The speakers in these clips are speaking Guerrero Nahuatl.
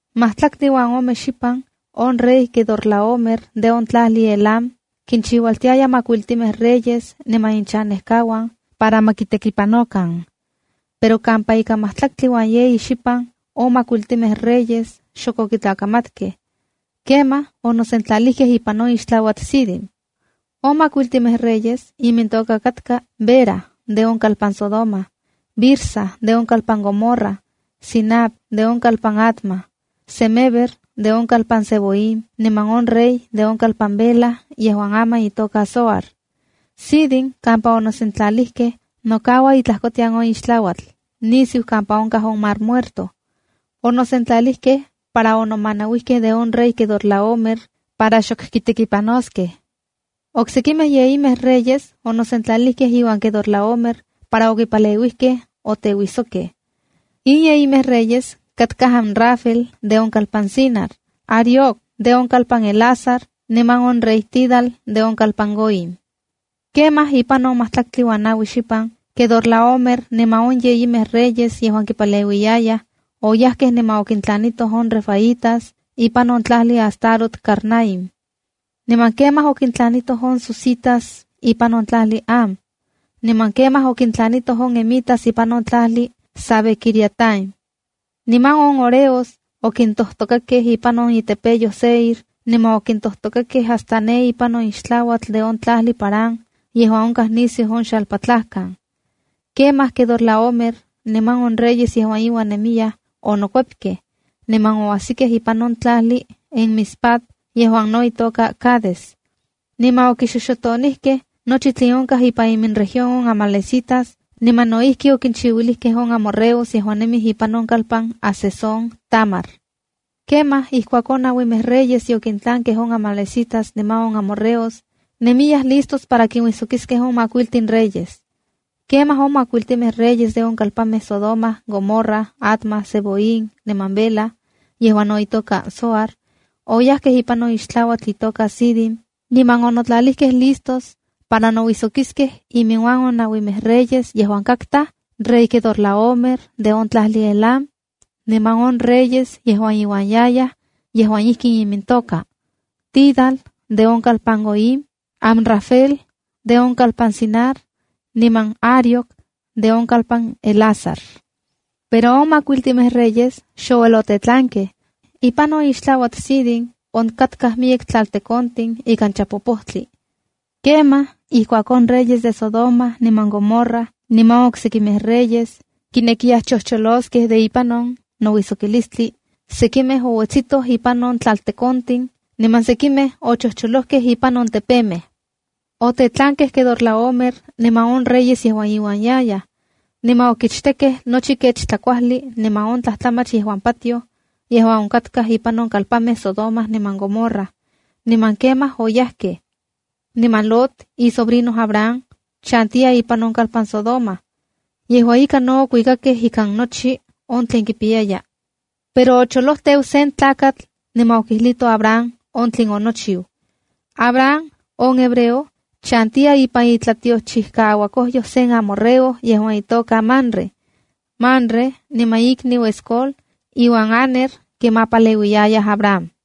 Matlaktli uan ome xipan on rey Quedorlaomer de on tlajli Elam, kinchiualtiaya makuiltimej reyes niman inchanejkauan para ma kitekipanokan. Pero kampa ika majtlaktli uan yeyi xipan, on makuiltimej reyes xok okitlakamatkej. Kemaj onosentlalijkej ipan on ixtlauatl Sidim. On makuiltinmej reyes imintoka katka Bera de on kalpan Sodoma, Birsa de on kalpan Gomorra, Sinab de on kalpan Adma, Semeber de on kalpan Zeboim niman on rey de on kalpan Bela yejuan aman itoka Zoar. Sidim kampa onosentlalijkej, nokaua intlajkotian on ixtlauatl nisiu kampa onkaj on Mar Muerto. Onosentlalijkej para onomanauijkej de on rey Quedorlaomer para xok okitekipanoskej. Oksekimej yeyimej reyes onosentlalijkej iuan Quedorlaomer para okipaleuijkej oteuijsokkej. In yeyimej reyes katkaj Amrafel de on kalpan Sinar, Arioc de on kalpan Elasar niman on rey Tidal de on kalpan Goim. Kemaj ipan on majtlaktli uan naui xipan, Quedorlaomer niman on yeyimej reyes yejuan kipaleuiyayaj, oyajkej niman okintlanitoj on refaitas ipan on tlajli Astarot Carnaim. Niman kemaj okintlanitoj on zuzitas ipan on tlajli Ham. Niman kemaj okintlanitoj on emitas ipan on tlajli Savé-quiriataim. Niman on horeos okintojtokakej ipan on itepeyoj Seir niman okintojtokakej hasta ne ipan on ixtlauatl de on tlajli Parán yejuan onkaj nisiu on xalpatlajkan. Kemaj Quedorlaomer niman on reyes yejuan iuan nemiyaj onokuepkej, niman oajsikej ipan on tlajli Enmispat yejuan no itoka Cades. Niman okixoxotonijkej nochi tlen onkaj ipan iminregión on amalecitas niman no ijki okinchiuilijkej on amorreos yejuan nemij ipan on kalpan Hazezón-tamar. Kemaj ijkuak on nauimej reyes yokintlankej on amalecitas niman on amorreos, nemiyaj listos para kinuijsokiskej on majkuiltin reyes. Kemaj on makuiltimej reyes de on kalpanmej Sodoma, Gomorra, Adma, Zeboim niman Bela (yejuan no itoka Zoar) oyajkej ipan on ixtlauatl itoka Sidim niman onotlalijkej listos para nouijsokiskej iminuan on nauimej reyes yejuan katkaj: rey Quedorlaomer de on tlajli Elam, niman on reyes yejuan iuan yayaj yejuan ijkin imintoka: Tidal de on kalpan Goim, Amrafel de on kalpan Sinar niman Arioc de on kalpan Elasar. Pero on makuiltimej reyes xouel otetlankej. Ipan on ixtlauatl Sidim onkatkaj miyek tlaltekontin ikan chapopojtli. Kemaj ijkuak on reyes de Sodoma niman Gomorra niman on oksekimej reyes kinekiyaj chojcholoskej de ipan on nouijsokitlstli, sekimej ouetsitoj ipan on tlaltekontin niman sekimej ochojcholojkej impan on tepemej. Otetlankej Quedorlaomer niman on reyes yejuan iuan yayaj. Niman okichtekkej nochi kech tlakuajli niman on tlajtlamach yejuan patioj, yejuan onkatkaj ipan on kalpanmej Sodoma niman Gomorra. Niman kemaj oyajkej. Niman Lot, isobrino Abram, chantiya ipan on kalpan Sodoma. Yejua ika, no okuikakej ikan nochi on tlen kipiyaya. Pero ocholoteu se tlakatl niman okijlito Abram on tlen onochiu. Abram, on hebreo, chantiya ipan itlatiochijkaauakojyoj sen amorreo yejuan itoka Mamre. Mamre niman ikniu Escol iuan Aner kimapaleuiyayaj Abram.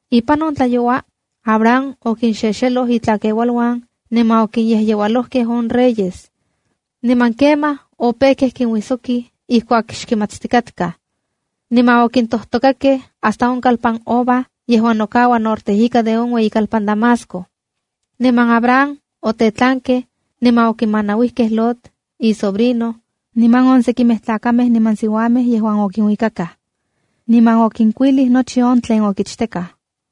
Ipan on tlayoua, Abram okinxexeloj itlakeualuan niman okinyejyeualojkej on reyes. Niman kemaj opejkej kinuijsokij ijkuak xkimatstikatkaj. Niman okintojtokakej hasta on kalpan Hoba yejuan nokaua norte ika de on ueyikalpan Damasco. Niman Abram otetlankej, niman okimanauikej Lot isobrino, niman on sekimej tlakamej niman siuamej yejuan okinuikakaj. Niman okinkuilij nochi on tlen okichtekaj.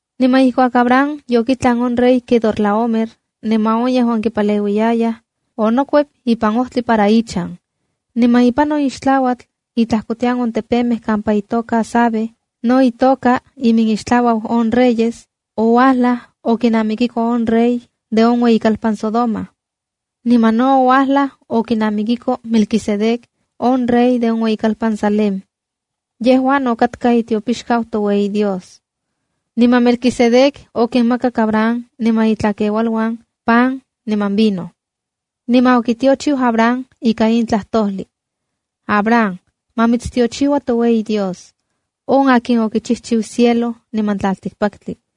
Niman ijkuak Abram yokitlan on rey Quedorlaomer niman on yejuan kipaleuiyayaj, onokuep ipan ojtli para ichan. Niman ipan on ixtlauatl intlajkotian on tepemej kampa itoka Savé (no itoka Iminixtlauau on Reyes), oualaj okinamikiko on rey de on ueyikalpan Sodoma. Niman no oualaj okinamikiko Melquisedec, on rey de on ueyikalpan Salema. Yejua no katka itiopixkau Dios yejuan Más Ueyixtikaj. Niman Melquisedec okinmakak Abram niman itlakeualuan pan niman vino. Niman okitiochiu Abram ika in tlajtojlij: “Abram, ma mitstiochiua to Dios yejuan Más Ueyixtikaj, on akin okichijchiu cielo niman tlaltikpaktli.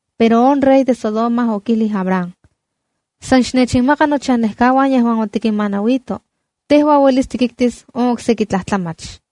Pero on rey de Sodoma okijlij Abram: —San xnechinmaka nochanejkauan yejuan otikinmanauito. Tejua uelis tikiktis on okseki tlajtlamach.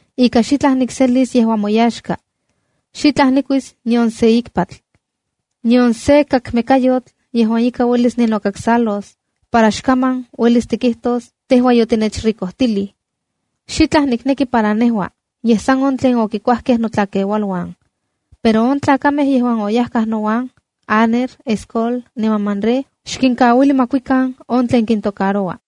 ika xitlaj nikselis yejuan moyaxka. Xitlaj nikuis nion sen ikpatl, nion sen kakmekayotl yejuan ika uelis ninokaksalos, para xkaman uelis tikijtos tejua ‘yotinechricojtilij’. Xitlaj nikneki para nejua, yej san on tlen okikuajkej notlakeualuan. Pero on tlakamej yejuan oyajkaj nouan, Aner, Escol niman Mamré, xkinkauili ma kuikan on tlen kintocaroua.